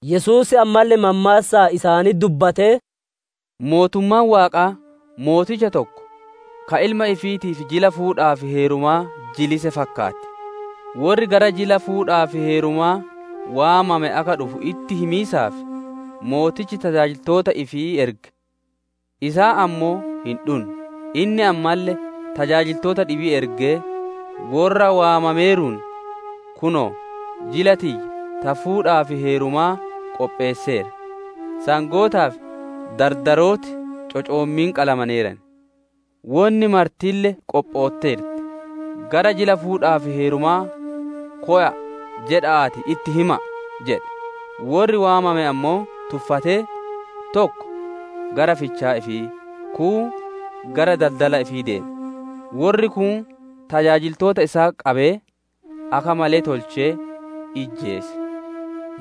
Yesuus ammalle mammaassaan isaanitti dubbatee, «Mootummaan Waaqaa mooticha tokko ka ilma ifiitiif jila fuudhaa fi heerumaa jilise fakkaatti. Worri gara jila fuudhaa fi heerumaa waamame akka dhufu itti himiisaaf, Mootichi tajaajiltoota ifii erge; isaan ammoo hin dhunne. Inni ammalle tajaajiltoota dhibii ergee, ‹Worra waamameeruun: Kunoo, jila tiyya ta fuudhaa fi heerumaa qopheesseera, sangootaa fi dardarooti cocooma qalamaneeran, wonni martille qophootteerti; gara jila fuudhaa fi heerumaa kowa'a jedha'aatii itti hima'a› jedhe. Worri waamame ammoo tuffatee, tokko gara fichaa ifii, kuun gara daldala ifii deeme; worri kuun tajaajiltoota isaa qabee, akka malee tolchee, ijjeese.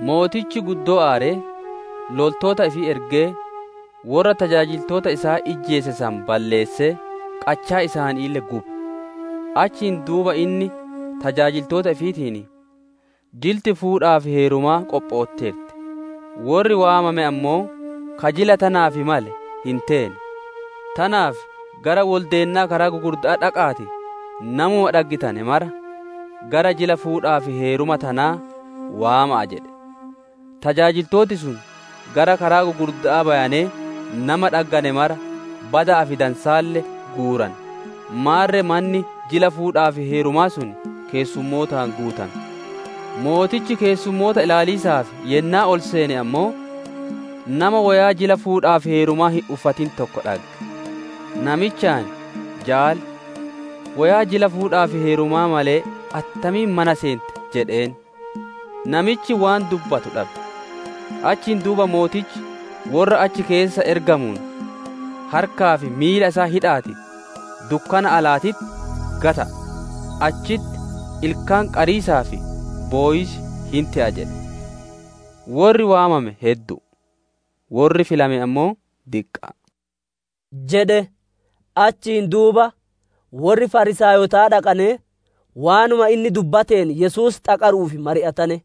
Mootichi guddoo aaree, loltoota ifii ergee, worra tajaajiltoota isaa ijjeese san balleessee, qachaa isaaniille gube. Achiin duuba inni tajaajiltoota ifiitiin, ‹Jilti fuudhaa fi heerumaa qophootteerti, worri waamame ammoo ka jila tanaaf male hin teene. Tanaaf gara woldeennaa karaa gugurda'aa dhaqa'aatii, namuma dhaggitane mara gara jila fuudhaa fi heeruma tanaa waama'a!› jedhe. Tajaajiltooti sun gara karaa gugurda'aa bayanee nama dhaggane mara bada'aa fi dansaalle guurane; maarre manni jila fuudhaa fi heerumaa sun keessummootaan guutame. «Mootichi keessumoota ilaaliisaaf yennaa ol seene ammoo, nama woyaa jila fuudhaa fi heerumaa hin uffatin tokko dhagge. Namichaan, ‹Jaali, woyaa jila fuudhaa fi heerumaa malee attamiin mana seente?› jedheen. Namichi waan dubbatu dhabe. Achiin duuba mootichi worra achi keessa ergamuun, ‹Harkaa fi miila isaa hidha'aatii, dukkana alaatitti gata'a. Achitti ilkaan qariisaa fi bowiis hin te'a› jedhe. Worri waamame heddu'u, worri filame ammoo diqqa'a» jedhe. Achiin duuba worri Fariisaayotaa dhaqanee waanuma inni dubbateen Yesuus xaqaru'uuf mari'atane.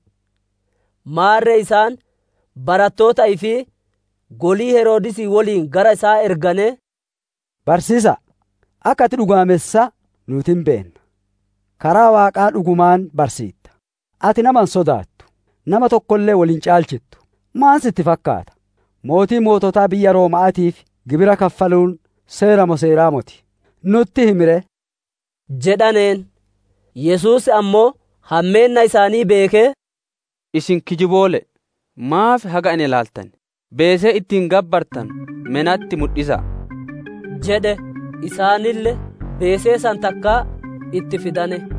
Maarre isaan barattoota ifii golii Heroodisii woliin gara isaa erganee, «Barsiisa'a, akka ati dhugaamessaa nuuti hin beenna; karaa Waaqaa dhugumaan barsiitta, ati nama hin sodaattu, nama tokkolle wol hin caalchittu. Maan sitti fakkaata? Mootii moototaa biyya Rooma'aatiif gibira kaffaluun seera moo seeraa moti? Nutti himi ree!» jedhaneen. Yesuus ammoo, hammeenna isaanii beekee, «Isin kijiboole'e! Maaf haga na ilaaltan? Beesee ittiin gabbartanu me natti mudhisa'a?» jedhe. Isaanille beesee san takka itti fidane.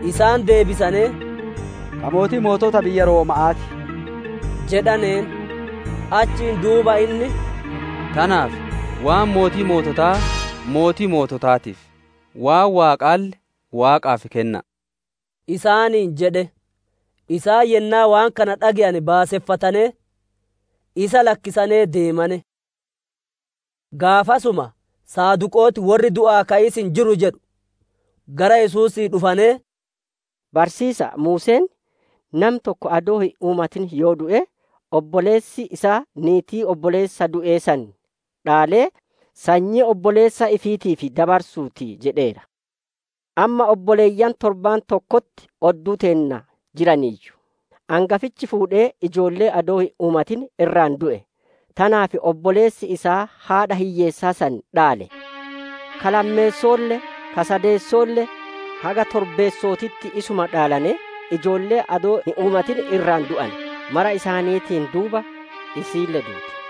Isaan deebisanee, «Ka mootii mootota biyya Rooma'aa ti» jedhaneen. Achiin duuba inni, «Tanaaf, waan mootii moototaa mootii moototaatiif, waan Waaqaalle Waaqaaf kenna'a» isaaniin jedhe. Isaan yennaa waan kana dhage'ane baaseffatanee, isa lakkisanee deemane. Gaafasuma Saduqooti, worri du'aa ka'iis hin jiru jedhu, gara Yesuusii dhufanee, «Barsiisa'a, Muuseen, ‹Nami tokko adoo hin uumatin yoo du'e, obboleessi isaa niitii obboleessa du'ee san dhaalee, sanyii obboleessa ifiitiif dabarsuu ti› jedheera. Amma obboleeyyan torba tokkotti odduu teenna jiraayyu; angafichi fuudhee, ijoollee adoo hin uumatin irraa du'e; tanaaf obboleessi isaa haadha hiyyeessaa san dhaale. Ka lammeesso'oolle, ka sadeesso'oolle, haga torbeesso'ootitti isuma dhaalanee ijoollee adoo hin uumatin irraa du'ane. Mara isaaniitiin duuba, isiille duute.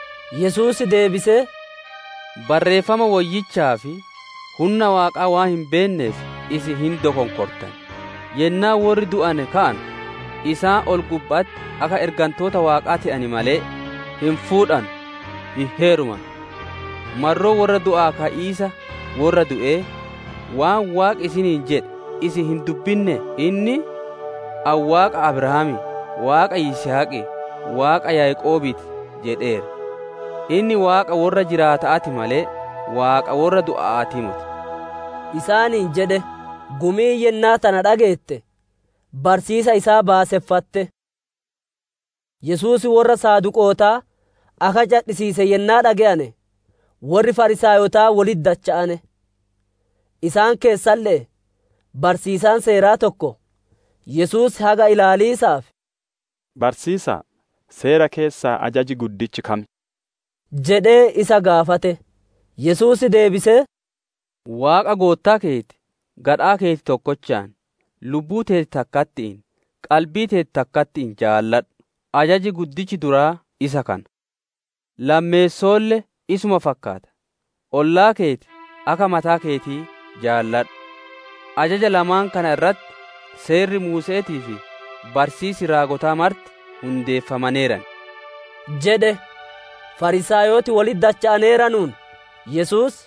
Yesuus deebisee, «Barreeffama Woyyichaa fi hunna Waaqaa waan hin beenneef, isin hin dokonkortan. Yennaa worri du'ane ka'anu, isaan ol-gubba'atti akka ergantoota Waaqaa te'an malee, hin fuudhanu, hin heerumanu. Marroo worra du'aa ka'iisa worra du'ee, waan Waaqi isiniin jedhe isin hin dubbinnee? Inni, ‹Ani Waaqa Abrahaamii, Waaqa Yisihaqii, Waaqa Yaaqoobii ti› jedheera. Inni Waaqa worra jiraata'aa ti malee, Waaqa worra du'a'aatii moti» isaaniin jedhe. Gumiin yennaa tana dhageette, barsiisa isaa baaseffatte. Yesuus worra Saduqootaa akka cadhisiise yennaa dhage'ane, worri Fariisaayotaa wolitti dacha'ane. Isaan keessaalle'ee, barsiisaan Seeraa tokko, Yesuus haga ilaaliisaaf, «Barsiisa'a, Seera keessaa ajaji guddichi kam?» jedhee isa gaafate. Yesuus deebisee, « ‹Waaqa Goottaa keeti, gadhaa keeti tokkochaan, lubbuu teeti takkatti'iin, qalbii teeti takkatti'iin jaaladhu›. Ajaji guddichi duraa isaa kana. Lammeessoolle isuma fakkaata: ‹Ollaa keeti akka mataa keetii jaaladhu›. Ajaja lamaan kana irratti Seerri Muuse'eetii fi barsiisi raagotaa marti hundeeffamaneeran» jedhe. Fariisaayoti wolitti dacha'aneeranuun, Yesuus,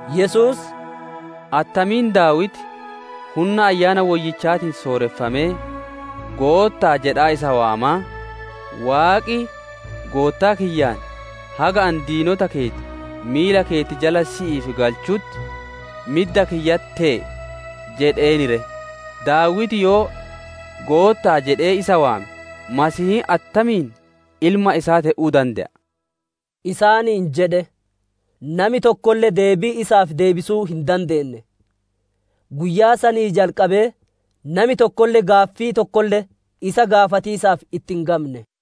Yesuus, «Attamiin Daawiti hunna Ayyaana Woyyichaatiin sooreffamee ‹Goottaa› jedhaa isa waamaa, «‹Waaqi Goottaa kiyyaan, haga ani diinota keeti miila keeti jala si'iif galchutti, Midda kiyyatti tee'i› jedheen ree? Daawiti yoo, ‹Goottaa› jedhee isa waame, Masiihiin attamiin ilma isaa te'uu dande'a?» isaaniin jedhe. Nami tokkolle deebii isaaf deebisuu hin dandeenne. Guyyaa sanii jalqabee nami tokkolle gaaffii tokkolle isa gaafatiisaaf itti hin gamne.